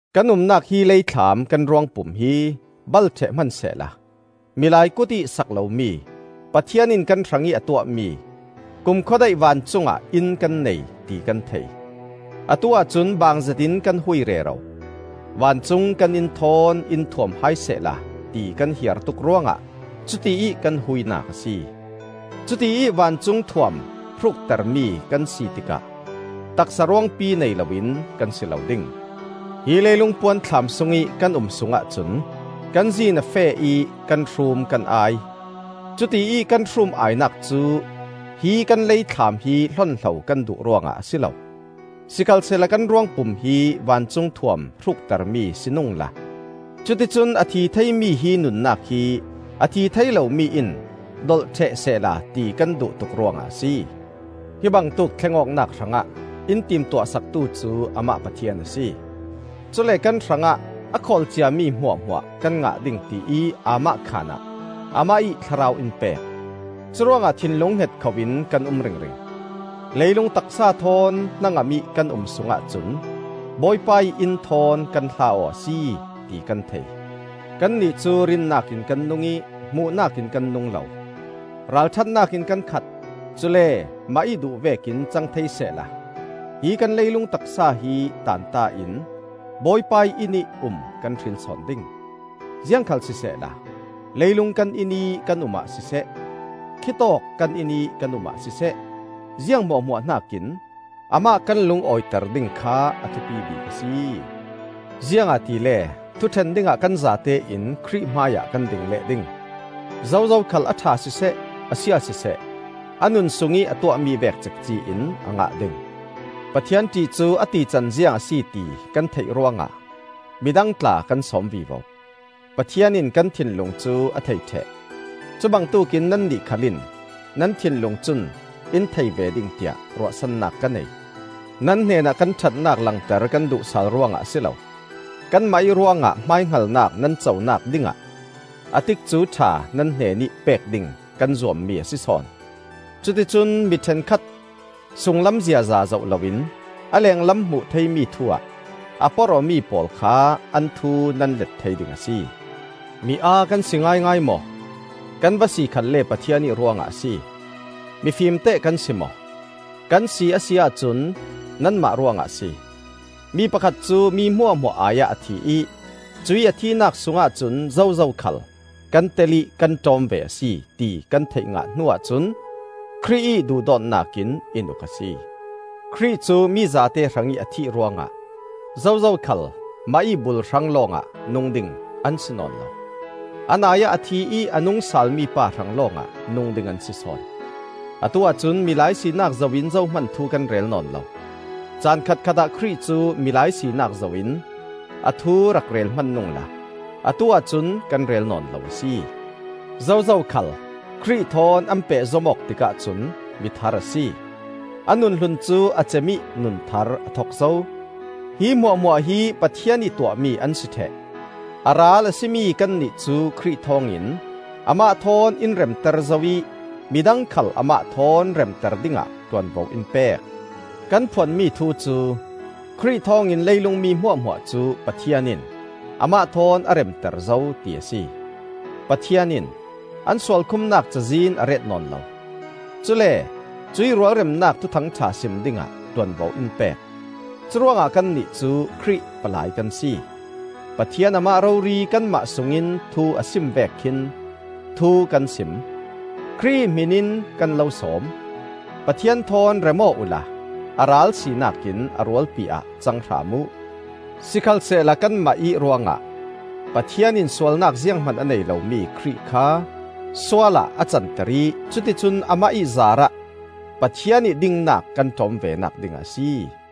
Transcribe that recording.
Kan umnak hi leithlam kan ruangpum hi bal ṭheh hmansehla milai kutih sak lomi Pathian in kan hrangih a tuahmi kumkhuadaih vancungah inn kan nei ti kan thei. A tu ahcun baangzet in kan hui rero; vancung kan inn thawn in thuam hai sehla ti kan hiar tuk ruangah cutiih kan huinak a si. Cutiih vancung thuam hruktermi kan si tikah taksa ruangpi nei loin kan si lo ding. Hi leilung puanthlam sungih kan um sungah cun kan zin a fee ih kan hrum kan ai. Cutiih kan hrum-ainak cu hi kan leithlam hi hlonhlo kan duh ruangah a si lo; sikhalsehla kan ruangpum hi vancung thuam hruktermi si nungla cuticun a thi theimi hi nunnak hi a thi thei lomi in dolh ṭheh sehla ti kan duh tuk ruangah a si. Hi bangtuk thleng awknak hrangah in timtuah saktu cu amah Pathian a si. Cule kan hrangah a khawlciami hmuahhmuah kan ngah ding ti ih aamahkhan ah amah ih Thlarau in pek. Curuangah thinlung hngetkhoh in kan um ringring. Leilung taksa thawn hnangam ih kan um sungah cun Bawipa ih inn thawn kan hla aw a si, ti kan thei. Kannih cu rinnak in kan nung ih hmuhnak in kan nung lo. Ralṭhatnak in kan khat; cule mah ih duh vekin cang thei sehla hi kan leilung taksa hi taanta in Bawipa ih inn ih um kan hril sawn ding. Ziangkhal sisehla leilung kan inn ih kan um ah siseh, khitawk kan inn ih kan um ah siseh, ziang hmuahhmuah hnakin amah kan lungawiter ding kha a thupi bik a si. Ziangahtile thuṭhen dingah kan zate in Khrih hmai ah kan ding leh ding. Zozo khal a ṭha siseh, a sia siseh a nunsung ih a tuahmi vek cekci in a ngah ding. Pathian ṭih cu a tican ziang a si ti kan theih ruangah midang tla kan sawm vivo. Pathian in kan thinlung cu a thei ṭheh. Cubangtuk in nannih khal in nan thinlung cun in thei ve ding tiah ruahsannak ka nei. Nan hnenah kan ṭhatnak langter kan duh sal ruangah a si lo; kanmah ih ruangah hmaihngalnak nan conak dingah a tikcu ṭha nan hnenih pek ding kan zuammi a si sawn. Cuticun mi ṭhenkhat sunglam ziaza zoh loin a lenglam hmuh theimi thu-ah a porh awmi pawl kha an thu nan let thei ding a si. Miaa kan si ngaingai maw? Kan va si khalle Pathian ih ruangah a si. Mifim teh kan si maw? Kan si a si ahcun nanmah ruangah a si. Mi pakhat cu mi hmuahhmuah aiah a thi ih cuih a thihnak sungah cun zozo khal kan tel ih kan ṭawm ve a si, ti kan theih ngah hnu-ah cun Khrih ih duhdawtnak in in uk a si. Khrih cu mi zate hrangih a thih ruangah zozo khal mahih bul hrang lawngah nung ding an si nawn lo; an aiah a thi ih a nungsal mipa hrang lawngah nung ding an si sawn. Atu-ah cun milai sinak zoh in zohman thu kan rel nawn lo. Caan khat khatah Khrih cu milai sinak zoh in a thu rak rel hman nungla atu-ah cun kan rel nawn lo a si. Zozo khal Khrih thawn an pehzom awk tikah cun mithar a si; a nun hlun cu a cem ih nun thar a thok zo. Hi hmuahhmuah hi Pathian ih tuahmi an si ṭheh; a ral a si mi kannih cu Khrih thawngin Amah thawn in remter zo ih midang khal Amah thawn remter dingah ṭuanvo in pek. Kan phuanmi thu cu: Khrih thawngin leilung mi hmuahhmuah cu Pathian in Amah thawn a remter zo, ti a si. Pathian in an sual khumnak cazin a ret nawn lo; cule cuih rualremnak thuthangṭha sim dingah ṭuanvo in pek. Curuangah kannih cu Khrih palai kan si. Pathian amah rori kanmah sungin thu a sim vek khin thu kan sim. Khrih ih hmin in kan lo sawm: Pathian thawn rem-aw uhla a ral sinak in a rualpi ah cang hram uh. Sikhalsehla kanmah ih ruangah Pathian in sualnak zianghman a nei lomi Khrih kha sual ah a canter ih cuticun amah ih zaarah Pathian ih dingnak kan ṭawm venak dingah a si.